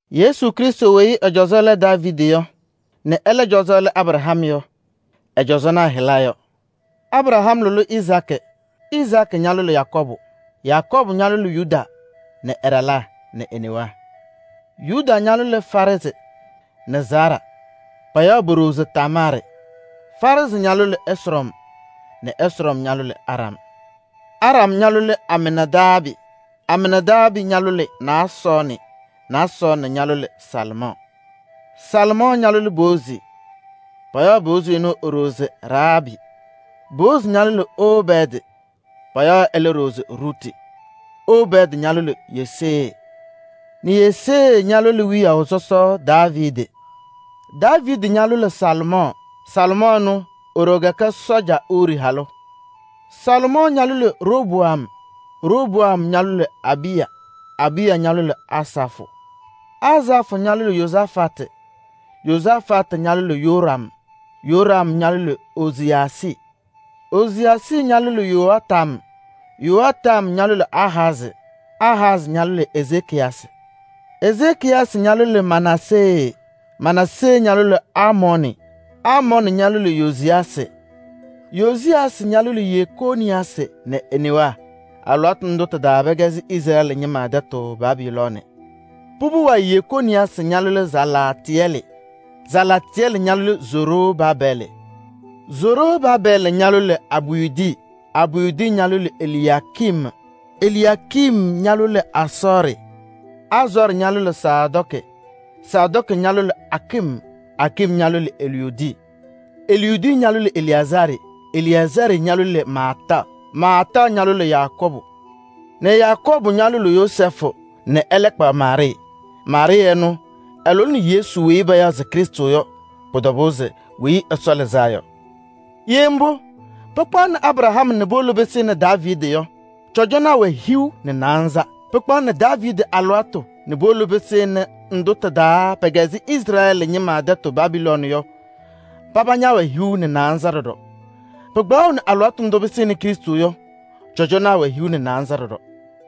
Yesu Krɩstʋ weyi ɛ-cɔzɔ lɛ Daaviidi nɛ ɛlɛ cɔzɔ lɛ Abraham yɔ, ɛ-cɔzɔnaa hɩla yɔ: Abraham lʋlɩ Izaakɩ, Izaakɩ ñalʋlɩ Yakɔɔbʋ, Yakɔɔbʋ ñalʋlɩ Yuda nɛ ɛ-ɖalaa nɛ e-newaa. Yuda ñalʋlɩ Faarɛɛzɩ nɛ Zaaraa. Payaɣ po-ɖoo se Tamaarɩ. Faarɛɛzɩ ñalʋlɩ Ɛsrɔm, Ɛsrɔm ñalʋlɩ Aram, Aram ñalʋlɩ Aminaadaabɩ, Aminaadaabɩ ñalʋlɩ Naasɔɔnɩ, Naasɔɔnɩ ñalʋlɩ Salɩmɔɔ, Salɩmɔɔ ñalʋlɩ Boozi. Payaɣ Boozi ɛnʋ e-ɖoo se Rahaabɩ. Boozi ñalʋlɩ Obɛɛdɩ. Payaɣ ɛlɛ ɖoo se Ruti. Obɛɛdɩ ñalʋlɩ Yesee nɛ Yesee ñalʋlɩ wiyaʋ sɔsɔ Daaviidi. Daaviidi ñalʋlɩ Salomɔɔ. Salomɔɔ ɛnʋ e-ɖoo kɛkɛ sɔɔja Urii halʋ. Salomɔɔ ñalʋlɩ Roboam, Roboam ñalʋlɩ Abiya, Abiya ñalʋlɩ Asafʋ, Asafʋ ñalʋlɩ Yozafatɩ, Yozafatɩ ñalʋlɩ Yoram, Yoram ñalʋlɩ Oziyaasɩ, Oziyaasɩ ñalʋlɩ Yoatam, Yoatam ñalʋlɩ Ahazɩ, Ahazɩ ñalʋlɩ Ezekiyasɩ, Ezekiyasɩ ñalʋlɩ Manaasee, Manaasee ñalʋlɩ Amɔɔnɩ, Amɔɔnɩ ñalʋlɩ Yoziyaasɩ, Yoziyaasɩ ñalʋlɩ Yekooniyaasɩ nɛ e-newaa. Alɩwaatʋ ndʋ tɩ-taa pɛkɛzɩ Izrɛɛlɩ ñɩma tɛtʋ Babilooni. Pʋbʋ wayɩ Yekooniyaasɩ ñalʋlɩ Salaatɩyɛlɩ, Salaatɩyɛlɩ ñalʋlɩ Zorobaabɛɛlɩ, Zorobaabɛɛlɩ ñalʋlɩ Abiyudi, Abiyudi ñalʋlɩ Eliyaakim, Eliyaakim ñalʋlɩ Azɔɔrɩ, Azɔɔrɩ ñalʋlɩ Sadɔɔkɩ, Sadɔɔkɩ ñalʋlɩ Akim, Akim ñalʋlɩ Eliyudi Eliyudi ñalʋlɩ Eleyazaarɩ, Eleyazaarɩ ñalʋlɩ Maataɣ, Maataɣ ñalʋlɩ Yakɔɔbʋ nɛ Yakɔɔbʋ ñalʋlɩ Yozɛɛfʋ nɛ ɛlɛ kpaɣ Maarɩɩ. Maarɩɩ ɛnʋ ɛlʋlɩnɩ Yesu weyi payaɣ se Krɩstʋ yɔ, pʋ-tɔbʋʋ se Weyi Ɛsɔ Lɩzaa Yɔ. Ye mbʋ, pɩkpaɣʋnɩ Abraham nɛ puwolo pɩsɩnɩ Daaviidi yɔ, cɔzɔnaa wɛ hiu nɛ naanza. Pɩkpaɣ Daaviidi alɩwaatʋ nɛ puwolo pɩsɩnɩ ndʋ tɩ-taa pɛkɛzɩ Izrɛɛlɩ ñɩma tɛtʋ Babiloon yɔ, paba ñɛwɛ hiu nɛ naanza ɖɔɖɔ. Pɩkpaɣʋnɩ alɩwaatʋ ndʋ nɛ puwolo pɩsɩnɩ Krɩstʋ yɔ, cɔzɔnaa wɛ hiu nɛ naanza ɖɔɖɔ.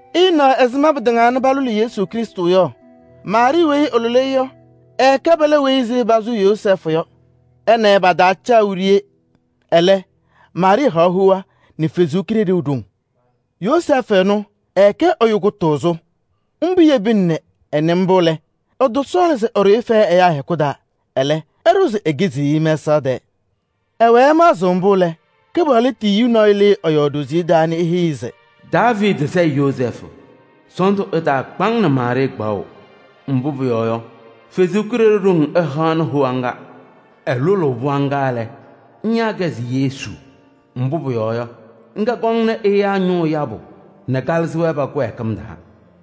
Ɩna ɛzɩma pɩtɩŋaa nɛ palʋlɩ Yesu Krɩstʋ yɔ. Maarɩɩ weyi ɛlʋlɩ-ɩ yɔ, ɛɛkɛ pɛlɛ weyi posu Yozɛɛfʋ yɔ. Ɛ nɛ ɩ pataacaɣ wiɖiyi. Ɛlɛ, Maarɩɩ haɣ hoa nɛ Ɛsɔ Kalɩzaɣ ɖoŋ. Yozɛɛfʋ ɛnʋ, ɛkɛ ɛyʋ kʋtʋʋzʋ. Mbʋ yebina nɛ ɛna-ɩ mbʋ lɛ, ɛtɔsɔɔlɩ se ɛɖʋ-ɩ fɛyɛ ɛyaa hɛkʋ taa. Ɛlɛ ɛɖʋ se ekiziɣ-i mɛsaɣ tɛɛ. Ɛwɛɛ ɛmaɣzɩɣ mbʋ lɛ, Kɩpaɣlʋ tiyiyu nɔɔyʋ lɩɩ ɛ-yɔɔ ɖoziye taa nɛ eheyi-i se: “Daaviidi sayɩ Yozɛɛfʋ! Sɔɔndʋ ɛtaakpa-ŋ nɛ Maarɩɩ kpaɣʋ. Mbʋ pʋyɔɔ yɔ, Ɛsɔ Kalɩzaɣ ɖoŋ ɛhaɣnɩ hoa ŋga. Ɛlʋlʋʋ pɩɣa ŋga lɛ, ŋyaa-kɛ se Yesu, mbʋ pʋyɔɔ yɔ, ŋga kɔŋnɩ ɛyaa ñʋʋ yabʋ nɛ kalɩzɩ-wɛ pa-kɩwɛɛkɩm taa.”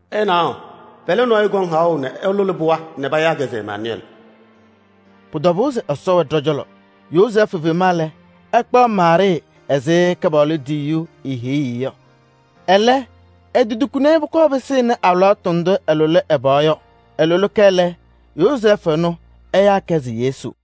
“Ɩnaɣ, pɛlɛ nɔɔyʋ kɔŋ haɣʋ nɛ ɛlʋlɩ pɩɣa nɛ payaa-kɛ se Emaanʋyɛɛlɩ.” Pʋ-tɔbʋʋ se Ɛsɔ wɛ ɖɔ-cɔlɔ. Yozɛɛfʋ fema lɛ, ɛkpaɣ Maarɩɩ ɛzɩ Kɩpaɣlʋ tiyiyu heyuu-i yɔ. Ɛlɛ, etotukini-i nɛ pʋkɔɔ pɩsɩnɩ alɩwaatʋ ndʋ ɛlʋlɩ ɛ-pɩɣa yɔ. Ɛlʋlɩ-kɛ lɛ, Yozɛɛfʋ ɛnʋ ɛyaa-kɛ se Yesu.